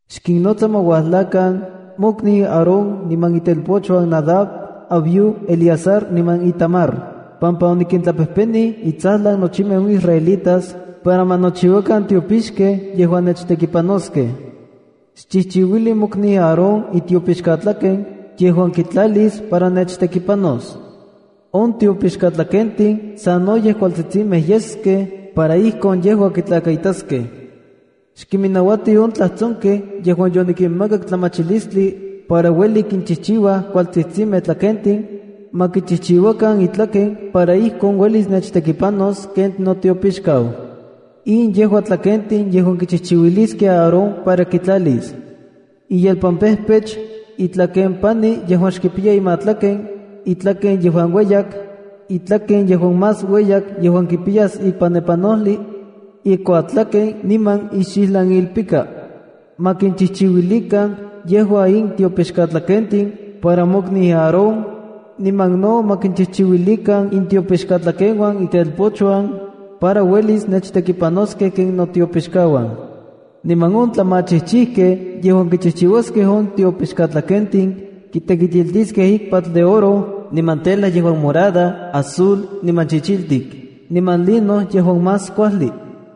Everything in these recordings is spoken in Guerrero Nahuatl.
’Xkinnotsa para ma uajlakan mokniu Aarón niman itelpochuan Nadab, Abiú, Eleazar niman Itamar, pampa onikintlapejpenij intsajlan nochimej on israelitas para ma nochiuakan tiopixkej yejuan nechtekipanoskej. Xchijchiuili mokniu Aarón itiopixkatlaken yejuan kintlalis para nechtekipanos. On tiopixkatlakentin sanoyej kualtsitsimej yeskej para ijkon yejua kitlakaitaskej. Xkiminnauati on tlajtsonkej yejuan yonikinmakak tlamachilistli para ueli kichijchiuaj kualtsitsimej tlakentin, ma kichijchiuakan itlaken para ijkon uelis nechtekipanos ken notiopixkau. ’In yejua tlakentin yejuan kichijchiuiliskej Aarón para kitlalis: iyelpanpejpech, itlakempani yejuan xkipiya imatlaken, itlaken yejuan ueyak, itlaken yejuan más ueyak yejuan kipiyas ikpanepanojli, ikuatlaken, niman ixijlanilpika. Ma kinchijchiuilikan yejua in tiopixkatlakentin para mokniu Aarón, niman no ma kinchijchiuilikan intiopixkatlekeuan itelpochuan, para uelis nechtekipanoskej ken notiopixkauan. Niman on tlamachijchijkej yejuan kichijchiuaskej on tiopixkatlakentin, kitekitiltiskej ikpatl de oro niman tela yejuan morada, azul, niman chichiltik niman lino yejuan más kuajli.”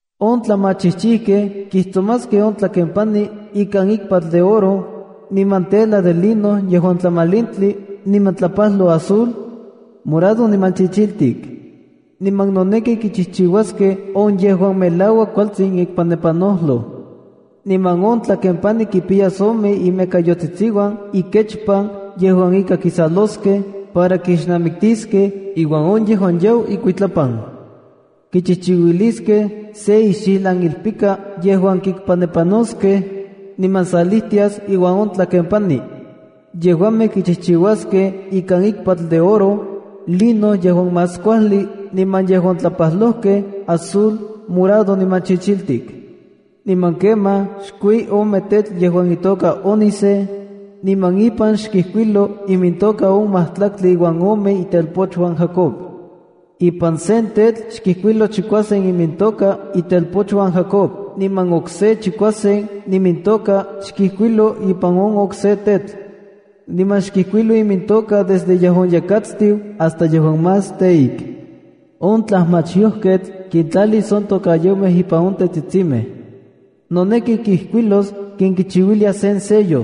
’On tlamachijchijkej kijtsomaskej on itlakempani ikan ikpatl de oro, niman tela de lino yejuan tlamalintli niman tlapajloj azul, morado niman chichiltik. Niman noneki kichijchiuaskej on yejuan melauak kualtsin ikpanepanojloj. Niman on tlakempani kipiyas ome imekayotsitsiuan ikechpan yejuan ika kisaloskej para kixnamiktiskej iuan on yejuan yau ikuitlapan. Kichijchiuiliskej se ixijlan ilpika yejuan kikpanepanoskej, niman salijtias iuan on tlakempani. Yejuamej kichijchiuaskej ikan ikpatl de oro, lino yejuan más kuajli niman yejuan tlapajlojkej azul, morado niman chichiltik. ’Niman kemaj xkui ome tetl yejuan itoka ónice, niman ipan xkijkuiloa imintoka on majtlaktli uan omemej itelpochuan Jacob. Ipan sen tetl xkijkuilo chikuasen imintoka itelpochuan Jacob niman okse chikuasen imintoka xkijkuilo ipan on okse tetl. Niman xkijkuilo imintoka desde yejuan yekatstiu hasta yejuan más teik. On tlajmachyojketl kintlalis on tokayomej ipan on tetsitsimej. Noneki kijkuilos ken kichiuiliaj sen sello.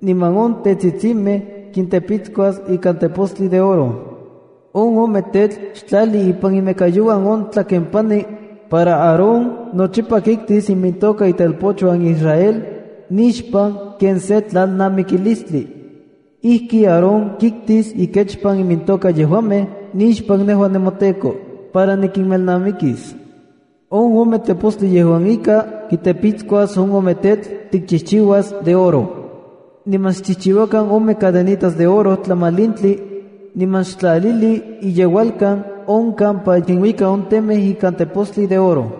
Niman on tetsitsimej kintepitskuas ika tepostli de oro. On ome tetl xtlali ipan imekayouan on tlakempani, para Aarón nochipa kiktis imintoka itelpochuan Israel nixpan ken se tlalnamikilistli. Ijki Aarón kiktis ikechpan imintoka yejuamej nixpan nejua nemoTEKO, para nikinmelnamikis. On ome tepostli yejuan ika tiktepitskuas on ome tetl tikchijchiuas de oro. Niman xchijchiuakan ome cadenitas de oro tlamalintli, niman xtlalili iyeualkan on kampa kinuika on temej ikan tepostli de oro.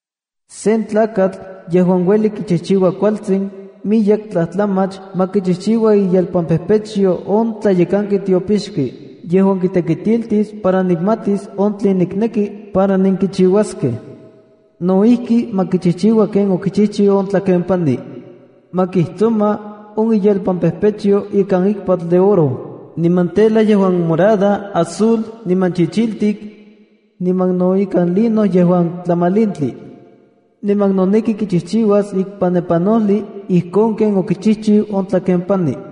’Sen tlakatl yejuan ueli kichijchiua kualtsin miyek tlajtlamach ma kichijchiua iyelpampejpechyo on tlayekanki tiopixki yejuan kitekitiltis para kimatis on tlen nikneki para nenkichiuaskej. No ijki, ma kichijchiua ken okichijchiu on tlakempani. Ma kijtsoma on iyelpampejpechyo ikan ikpatl de oro, niman tela yejuan morada, azul, niman chichiltik, niman no ikan lino yejuan tlamalintli. Niman noneki kichijchiuas ikpanepanojli ijkon ken okichijchiu on tlakempani.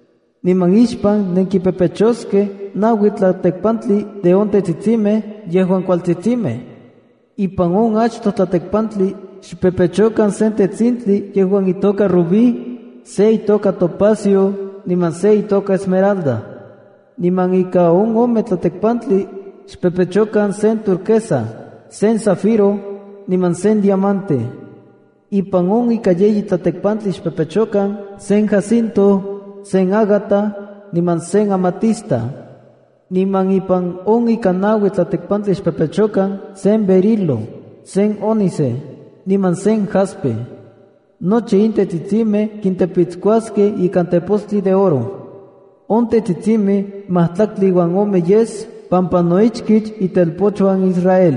Niman ixpan nenkimpepechoskej naui tlatekpantli de on tetsitsimej yejuan kualtsitsimej. Ipan on achtoj tlatekpantli xpepechokan sen tetsintli yejuan itoka rubí, se itoka topacio, niman se itoka esmeralda. Ipan ika ome tlatekpantli, xpepechokan sen turquesa, sen zafiro, niman sen diamante. Ipan on ika yeyi tlatekpantli xpepechokan sen jacinto, sen ágata, niman sen amatista. Niman ipan on ika naui tlatekpantli xpepechokan sen berilo, sen ónice, niman sen jaspe. Nochi in tetsitsimej kintepitskuaskej ikan tepostli de oro. On tetsitsimej majtlaktli uan ome yes pampa no ichkich itelpochuan Israel.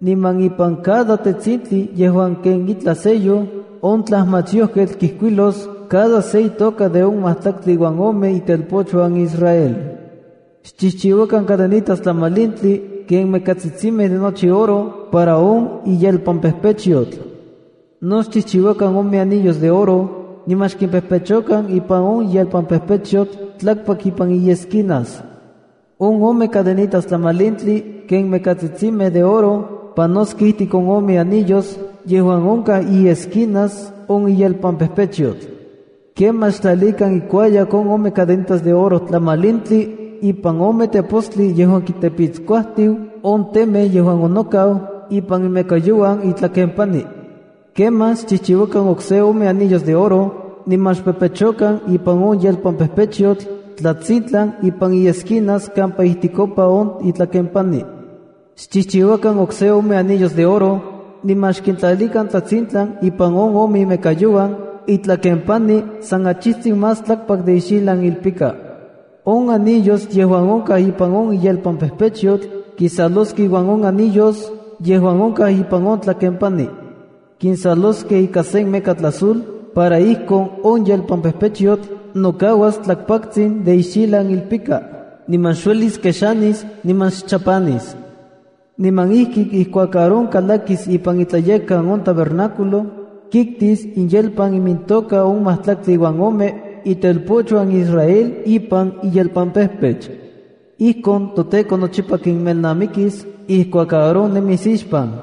Niman ipan on cada tetsintli yejuan ken itlaj sello, on tlajmachyojketl kijkuilos cada se itoka de on majtlaktli uan ome itelpochuan Israel. ’Xchijchiuakan cadenitas tlamalintli ken mekatsitsimej de nochi oro para on yelpampejpechyotl. No xchijchiuakan ome anillos de oro, niman xkimpepechokan ipan on yelpampejpechyotl tlakpak ipan iesquinas. On ome cadenitas tlamalintli ken mekatsitsimej de oro panoskej ijtik on ome anillos yejuan onkaj iesquinas on yelpampejpechyotl. Kemaj xtlalikan ikuayak on ome cadenitas de oro tlamalintli ipan on ome tepostli yejuan kintepiskuajtiu on temej yejuan onokaj ipan imekayouan itlakempani. Kemaj xchijchiuakan okse ome anillos de oro niman xkimpepechokan ipan on yelpampejpechyotl tlatsintlan ipan iesquinas kampa ijtikopa on itlakempani. Xchijchiuakan okse ome anillos de oro, niman xkintlalikan tlatsintlan ipan on ome imekayouan itlakempani san achijtsin más tlakpak de ixijlan ilpika. On anillos yejuan onkaj ipan on yelpampejpechyotl kinsaloskej iuan on anillos yejuan onkaj ipan on tlakempani. Kinsaloskej ika se mekatl azul para ijkon on yelpampejpechyotl nokauas tlakpaktsin de ixijlan ilpika niman xuelis kexanis niman xchapanis. Niman ijki ijkuak Aarón kalakis ipan iTlayekkan on tabernáculo, kiktis iyelpan imintoka on majtlaktli uan ome itelpochuan Israel ipan iyelpampejpech. Ijkon toTEKO nochipa kimelnamikis ijkuak Aarón nemis ixpan.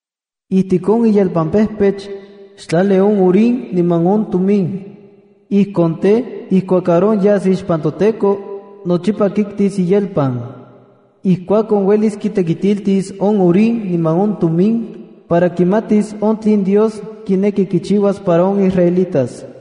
’Ijtik on iyelpampejpech, xtlali on Urim niman on Tumim. Ijkon tej, ijkuak Aarón yas ixpan toTEKO, nochipa kiktis iyelpan. Ijkuakon, uelis kintekitiltis on Urim niman on Tumim para kimatis on tlen Dios kineki nochiuas para on israelitas.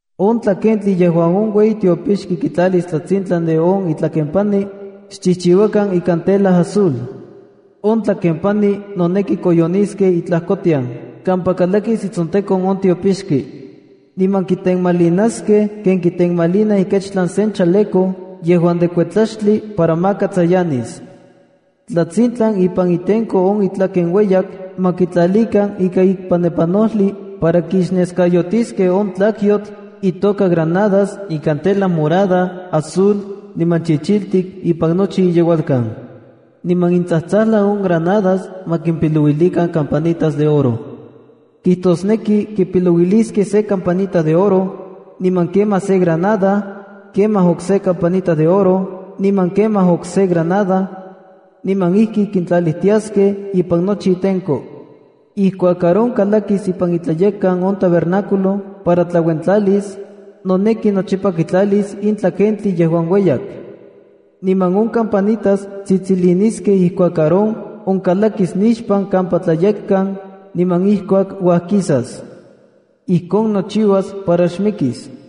’On tlakentli yejuan on ueyi tiopixki kitlalis tlatsintlan de on itlakempani, xchijchiuakan ikan tela azul. On tlakempani noneki koyoniskej itlajkotian kampa kalakis itsontekon on tiopixki. Niman kitenmalinaskej ken kitenmalinaj ikechtlan sen chaleco yejuan de kuetlaxtli para maka tsayanis. Tlatsintlan ipan itenko on itlaken ueyak, ma kitlalilikan ika ikpanepanojli para kixneskayotiskej on tlakyotl itoka granadas ikan tela morada, azul, niman chichiltik ipan nochi iyeualkan. Niman intsajtsajlan on granadas ma kimpipilouilikan campanitas de oro. Kijtosneki kipilouiliskej se campanita de oro, niman kemaj se granada, kemaj okse campanita de oro niman kemaj okse granada, niman ijki kintlalilijtiaskej ipan nochi itenko. Ijkuak Aarón kalakis ipan iTlayekkan on tabernáculo para tlauentlalis, noneki nochipa kitlalis in tlakentli yejuan ueyak. Niman on campanitas tsitsiliniskej ijkuak Aarón onkalakis nixpan kampa Tlayekkan niman ijkuak uajkisas. Ijkon nochiuas para xmikis.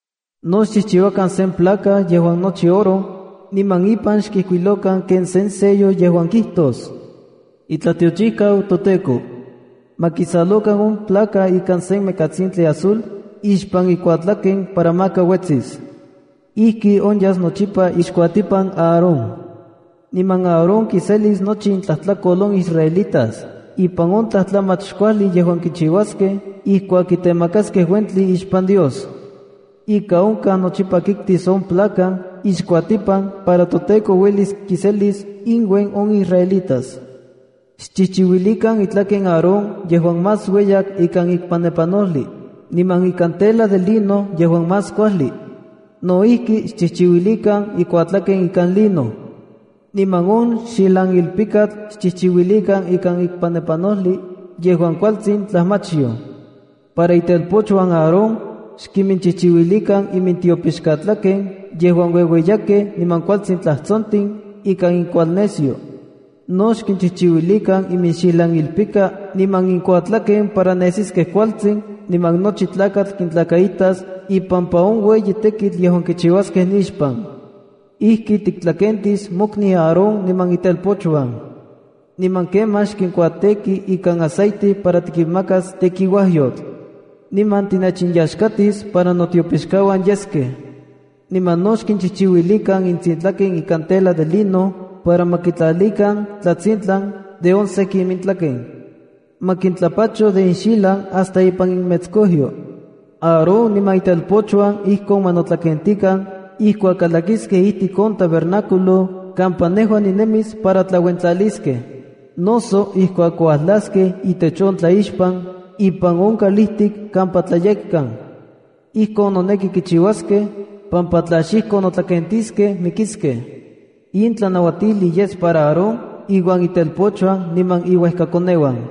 ’No xchijchiuakan sen placa yejuan nochi oro, niman ipan xkijkuilojkan ken sen sello yejuan kijtos: “ ITLATIOCHIJKAU TOTEKO”. Ma kisalokan on placa ika sen mekatsintli azul ixpan ikuatlaken para maka uetsis. Ijki onyas nochipa ixkuatipan Aarón. Niman Aarón kiselis nochi intlajtlakol on israelitas ipan on tlajtlamach xkuajli yejuan kichiuaskej ijkuak kitemakaskej uentli ixpan Dios. Ika onkaj nochipa kiktis on placa ixkuatipan para toTEKO uelis kiselis inuen on israelitas. ’Xchijchiuilikan itlaken Aarón yejuan más ueyak ikan ikpanepanojli, niman ikan tela de lino yejuan más kuajli. No ijki, xchijchiuilikan ikuatlaken ikan lino. Niman on xijlanilpikatl xchijchiuilikan ikan ikpanepanojli yejuan kualtsin tlajmachyoj. Para itelpochuan Aarón, xkinchijchiuilikan imintiopixkatlaken yejuan ueueyakej niman kualtsin tlajtsontin ikan inkualnesyo. No xkinchijchiuilikan iminxijlan ilpika niman ikuatlaken para nesiskej kualtsin niman nochi tlakatl kintlakaitas ipampa on ueyi tekitl yejuan kichiuaskej nixpan. ’Ijki tiktlakentis mokniu Aarón niman itelpochuan. Niman kemaj xkinkuatêki ikan aceite para tikinmakas tekiuajyotl. Niman tinechinyaxkatis para notiopixkauan yeskej. Niman no xkinchijchiuilikan intsintlaken ikan tela de lino para ma kitlalikan tlatsintlan de on seki imintlaken. Ma kintlapacho de inxijlan hasta ipan iminmetskojyo. Aarón niman itelpochuan ijkon ma notlakentikan ijkuak kalakiskej ijtik on tabernáculo kampa nejua ninemis para tlauentlaliskej, noso ijkuak uajlaskej itech on tlaixpan ipan on kalijtik kampa Tlayekkan. Ijkon noneki kichiuaskej, pampa tla xijkon notlakentiskej mikiskej. In tlanauatijli yes para Aarón iuan itelpochuan niman iuejkakoneuan.